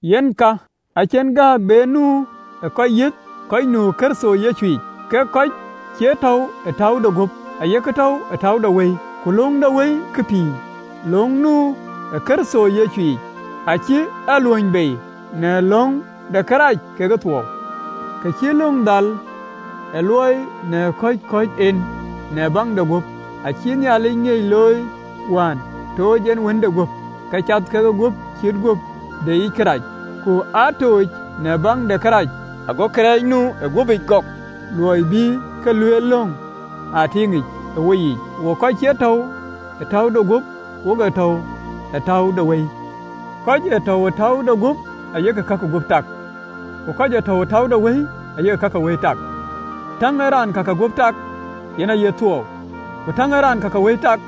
Yen ka, acïn gääk be nu ë kɔc yiëth kɔc nu ë Kërtho Yecuyic, kek kɔc cie tɔ̈u ë täu de guöp, ayek tɔ̈u ë täu de wëi. Ku löŋ de Wëi ke pïïr, löŋ nu ë Kërtho Yecuyic, acï a luöny bei në löŋ de kërac kekë thuɔɔu. Kë cï löŋ dhal ë luɔi, në kɔ̈c kɔ̈ɔ̈c en në baŋ de guöp, acïï Nhialic ŋiëc looi, wään tooc en Wënde guöp, ke cath ke guöp cït guöp deyic kërac, ku aa tuuc në baŋ de kërac, ago kërɛɛc nu ë guöpic gɔ̈k. Luɔi bï kë lueel löŋ aa tiiŋic ë woyiic, wok kɔc cie tɔ̈u ë täu de guöp, wok ee tɔ̈u ë täu de Wëi. Kɔc ee tɔ̈u ë täu de guöp ayek ka ke guöp tak, ku kɔc ee täu ë täu de Wëi ayek ka ke wëi tak. Täŋ ee raan ka ke guöp tak yen aye thuɔɔu, ku täŋ ee raan ka ke Wëi tak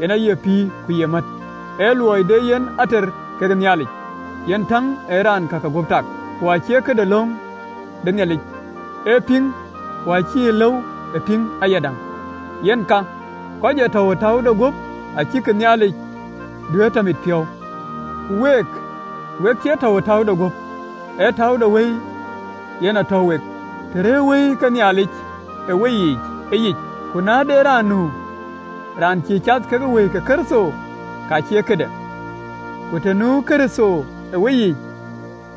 yen aye pïïr ku ye mät. Ë luɔi de yen ater kekë Nhialic, yen täŋ ee raan ka ke guöp tak, ku acïï këde löŋ de Nhialic ee piŋ, ku acie lëu ë pïŋ ayadäŋ. Yen ka, kɔc ee tɔ̈u ë täu de guöp acïkï Nhialic duëër tɔ mitpiɔ̈u. Ku week, wek cie tɔ̈u ë täu de guöp, ee täu de wëi yen täu wek, të rëërë Wëi ke Nhialic ë weyiic ëyic. Ku na de raan nu raan cïï cath ke Wëi ke Kërtho, ka cie këde. Ku të nu Kërtho ë weyiic,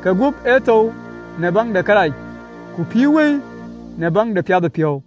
ke guöp ë thou në baŋ de kërac, ku pïïr Wëi në baŋ de piathëpiɔ̈u.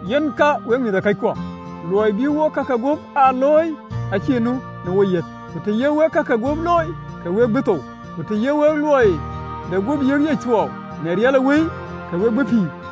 Yen ka, wek mïthëkɔckuɔ, luɔi bï wok ka ke guöp aa looi, acïï nu ë woyiic, ku të ya wek ka ke guöp looi, ke we bï thou, ku të ya wek luɔi de guöp yiëkic thuɔɔu në riɛl ë Wëi, ke we bï pïïr.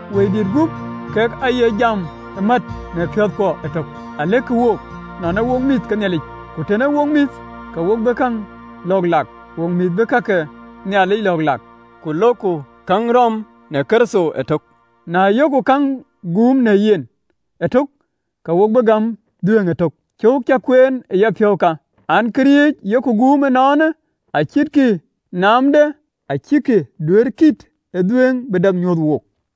Wëidït gup kek aye jam në piɔ̈ɔ̈thkuɔ ëtök, alëkkï wook nɔn ee wok mïth ke Nhialic. Ku tën ee wok mïth, ke wo bï käŋ lɔ̈ɔ̈k lak, wok ee mïth bï ka ke Nhialic lɔ̈ɔ̈k lak, ku löökku käŋ rɔm ë Kërtho ëtök, na yok käŋ guum në yen ëtök, ke wo bï gäm dhuëëŋ ëtök. Cöök cä kueen ë yapiɔ̈u ka an, Karac yok guum ënɔɔnë, acïnkï naamden, acïkï duëërë kiëët ë dhuëëŋ bï dap nyuöth wook.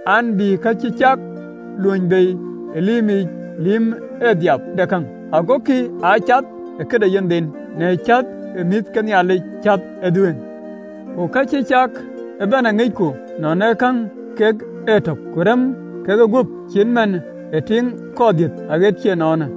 an, bï ka cï cak luöny bei ë lïïmic, lïïm ë dhiap de käŋ, agokï aa cath ë këde yenhden në cäth ë mïth ke Nhialic cath ë dhuëëŋ. Ku ka cï cak ëbɛ̈n aŋicku nɔn keŋ kek ëtök ku remë kegup acït man ë tiiŋ kɔɔr dhiëth aɣet cï ënɔɔnë.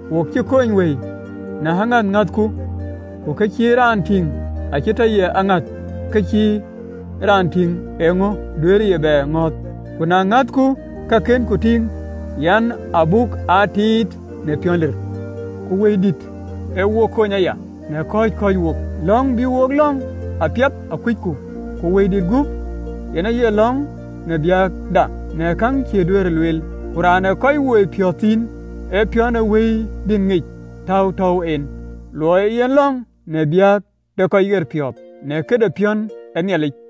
Wo cï kony wëi në aŋäth ŋäthku. Ku kë cï raan tïŋ acie tɔ ye aŋäth. Kë cï raan tïŋ eeŋö duëërë ye bɛ ŋɔ̈ɔ̈th? Ku na ŋäthku ka kënku tïŋ, yen abuk aa tiit në piɔ̈n lir. Ku Wëidït ee wo kony aya në kɔ̈c kɔ̈ɔ̈c wok, lɔ̈ŋ bï wok lɔ̈ŋ apiɛth akucku, ku Wëidït guöp yen aye lɔ̈ŋ në biäkda në keŋ cïï duëërë lueel. Ku Raan ë kɔc woi piɔ̈ɔ̈th thïn ee piɔ̈n ë Wëidït ŋic, täu tɔ̈u en, luɔi ee yen lɔ̈ŋ në biäk de kɔc ɣerpiɔ̈ɔ̈th në këde piɔ̈n ë Nhialic.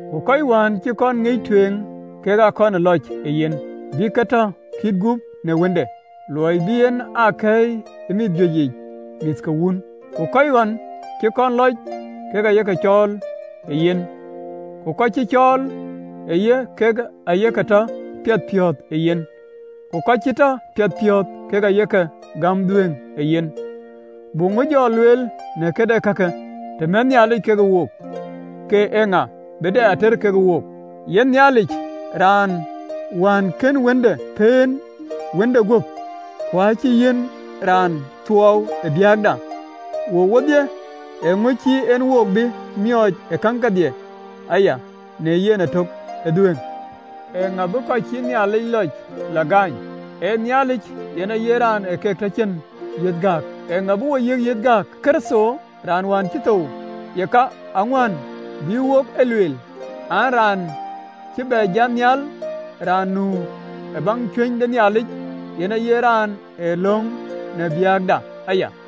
Ku kɔc wään cï kɔn ŋic tueŋ, kek aa kɔn lɔc ë yen, bï ke tɔ kït gup në Wënde, luɔi bï en aa kɛ̈ɛ̈i ë mïth juëc yiic mïth ke Wun. Ku kɔc ɣɔn cï kɔn lɔc, kek aye ke cɔɔl ë yen, ku kɔc cï cɔɔl ë yen, kek aye ke tɔ piɛthpiɔ̈ɔ̈th ë yen, ku kɔc cï tɔ piɛthpiɔ̈ɔ̈th, kek aye ke gäm dhuëëŋ ë yen. Buk ŋö jɔ lueel në këde kake? Të mɛtë Nhialic ke wook, ke eeŋa bï dɛ ater ke wook? Yen Nhialic, Raan wään kën Wënde pëën, Wënde guöp, ku acï e yiɛ̈n Raan thuɔɔu ë biäkda wook wodhie, ee kaŋö cïï en wo bï miɔɔc ë käŋ kedhie aya në yen ëtök ë dhuëëŋ? Eeŋa bï kɔc cïï Nhialic ke lɔc lɔ gaany? Ee Nhialic yen aye Raan ë keek tɔ cïn yiëth gääk! Eeŋa bï wo yiëk yiëth gääk? Ee Kërtho raan wään cï thou, yeka, aŋuän bï wok e lueel, an, raan cï bɛ jat nhial, raan nu ë baŋ cuëny de Nhialic, yen aye raan ee lɔ̈ŋ në biäkda aya.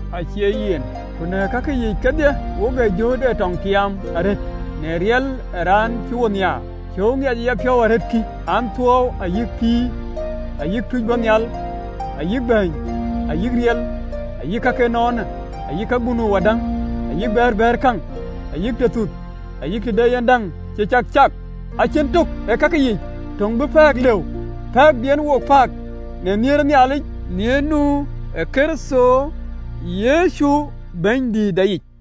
Acie yen, ku në kakë yiic kedhie wok ee jööt ee tɔŋ tiaam arëët në riɛl ë raan cï wo nhiaar. Cöök ŋiɛc ë yapiɔ̈u arëët kï an, Thuɔɔu, ayï pïïr, ayï tuuc bɔ̈ nhial, ayï bäny, ayï riɛl, ayï ka ke ënɔɔnë, ayï ka bï nu wadäŋ, ayï bɛ̈ɛ̈r bɛ̈ɛ̈rë käŋ, ayï tëthuth, ayï të de yen däŋ cï cak, acïn tök ee kakë yiic töŋ bï pɛ̈ɛ̈k lëu, pɛ̈ɛ̈k bï en wo pääk në nhiëër ë Nhialic, nhiëër nu ë Kërtho Yecu Bɛ̈nydïïtda yic.